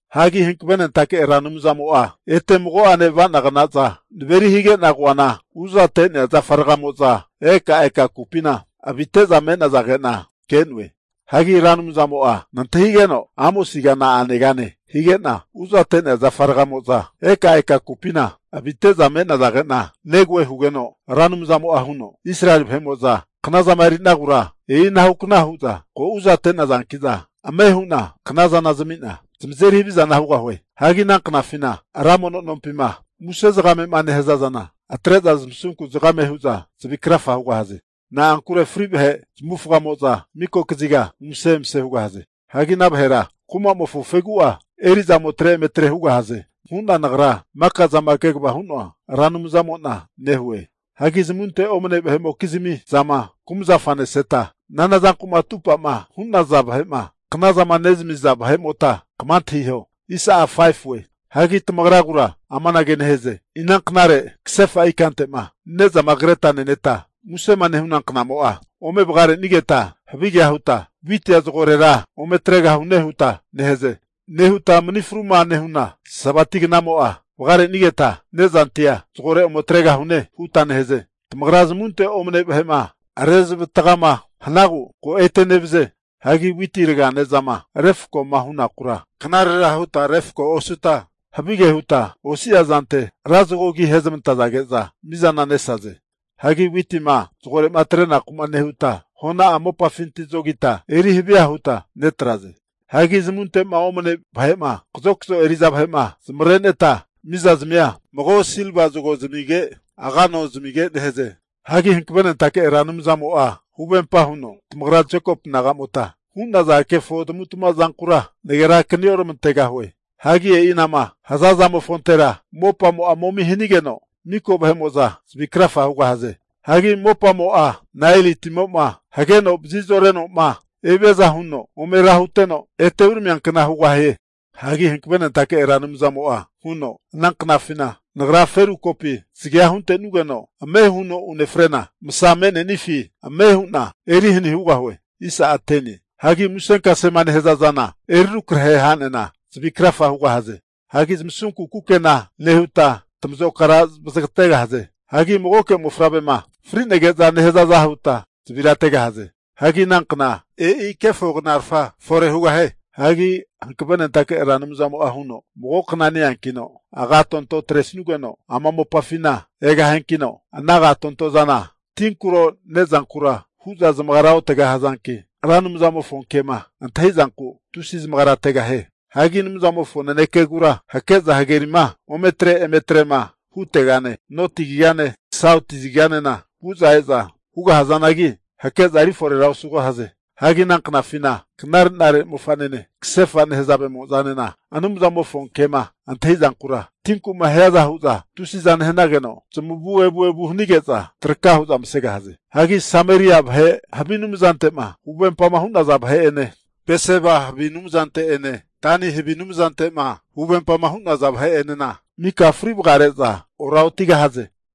Hagi Hankavenentake Ra Anumzamo'a ete mago'ane ava'nagnaza naveri hige'na koana, uzate'nea zafaragamo'za ekaeka kupina avite'za me'nazage'na ke'noe. Hagi Ra Anumzamo'a nantahigeno, Amosiga na'a negane hige'na, uzate'nea zafa ragamo'za eka eka kupina avite'za me'nazage'na negoe hugeno, Ra Anumzamo'a huno, Israeli vahe'mo'za knazama eri'nagura e'inahukna hu'za ko uzate'nazanki'na, ame hu'na knazana zamina zamazeri havizana hugahue. Hagi ana knafina, ra mono nompima muse zagame'ma nehaza zana atre'za zamasunku zagame hu'za zavi krafa hugahaze. Na'ankure fri vahe zamavufagamo'za mika kaziga umase emase hugahaze. Hagi ana vahera kumamofo fegu'a eri'za ometre ometre hugahaze, hu'na Nagra maka'zama kegava hu'noa Ra Anumzamo'na nehue. Hagi zamunte omane vahe'mokizmi zama kumazafa neseta, nanazanku'ma atupama hu'naza vahe'ma knazama nezamiza vahe'mota, kama antahiho. Hagi tamagragura amanage nehaze, inanknare kasefa ikante'ma ne'zama kreta neneta, musema nehu'na knamo'a ome vagarenigeta, havigea huta witia zagorera ome atregahune huta nehaze. Anage nehuta mani fruma nehuna Sabati knamo'a vagarenigeta nezantia zagore ome atregahune huta nehaze. Tamagra zamunte omane vahe'ma rezamavatagama hanagu ko ete nevaze. Hagi witi raga ne'zama refakoma hunakura, knarera huta refako osuta, havige huta osi'a zante ra zago agi ahezmantage'za mi'zana nesaze. Hagi witima zagore'ma atre'naku'ma nehuta hona'a mopafinti zogita eri havia huta netraze. Hagi zamunte'ma omane vahe'ma kazokzo eri'za vahe'ma zamavareneta, mizazmia mago silva zago zamige, aga ano zamige nehaze. Hagi Hankavenentake Ra Anumzamo'a huvempa huno, tamagra Jekopu naga'mota hu'naza kefo tamavu'tamava zankura nagera akani oramantegahue. Hagi e'inama haza zamofontera mopamo'a momi hanigeno, miko vahe'mo'za zavi krafa hugahaze. Hagi mopamo'a Naeli timo'ma hageno vazi zore'noma eviaza huno ome ra huteno, ete ome uramiankna hugahie. Hagi Hankavenentake Ra Anumzamo'a huno, Ananknafina Nagra feru kopi zagea huntenugeno ame huno unefrena, masa me'nenifi ame hu'na eri hani hugahue. Hagi musenkasema nehaza zana eri rukrahe hanena, zavi krafa hugahaze. Hagi tamasunku kukena nehuta, tamazokara vazagategahaze. Hagi magoke mofavrema frinege'za nehazaza huta zavira ategahaze. Hagi ana kna, e'i kefo knarafa fore hugahie. Hagi Hankavenentake Ra Anumzamo'a huno, Mago kna ne-eankina agatontoza atrenugeno ama mopafina egahiankino, ana agatonto zana tinkuro nezankura huza zamagara otegahazanki, Ra Anumzamofo kema antahizanku tusi zamagara tegahie. Hagi Anumzamofo nanekegura hake'za hagerima ome atre emetre'ma hutegane, noti kazigane, sauti kaziganena vu'za e'za hugahazanagi, hake'za eri forera osugahaze. Hagi ana knafina knare'nare mofa'nanene, kasefa nehazavemo'zanena Anumzamofo kema antahizankura tinkuma hiaza huza tusiza nehanageno zamavu evu evu hanige'za traka huza masegahaze. Hagi Sameria vahe havi anumzante'ma huvempama hu'naza vahe'ene, Beseba havi anumzante'ene Dani havi anumzante'ma huvempa hu'naza vahe'enena, mika fri vagare'za oraotigahaze.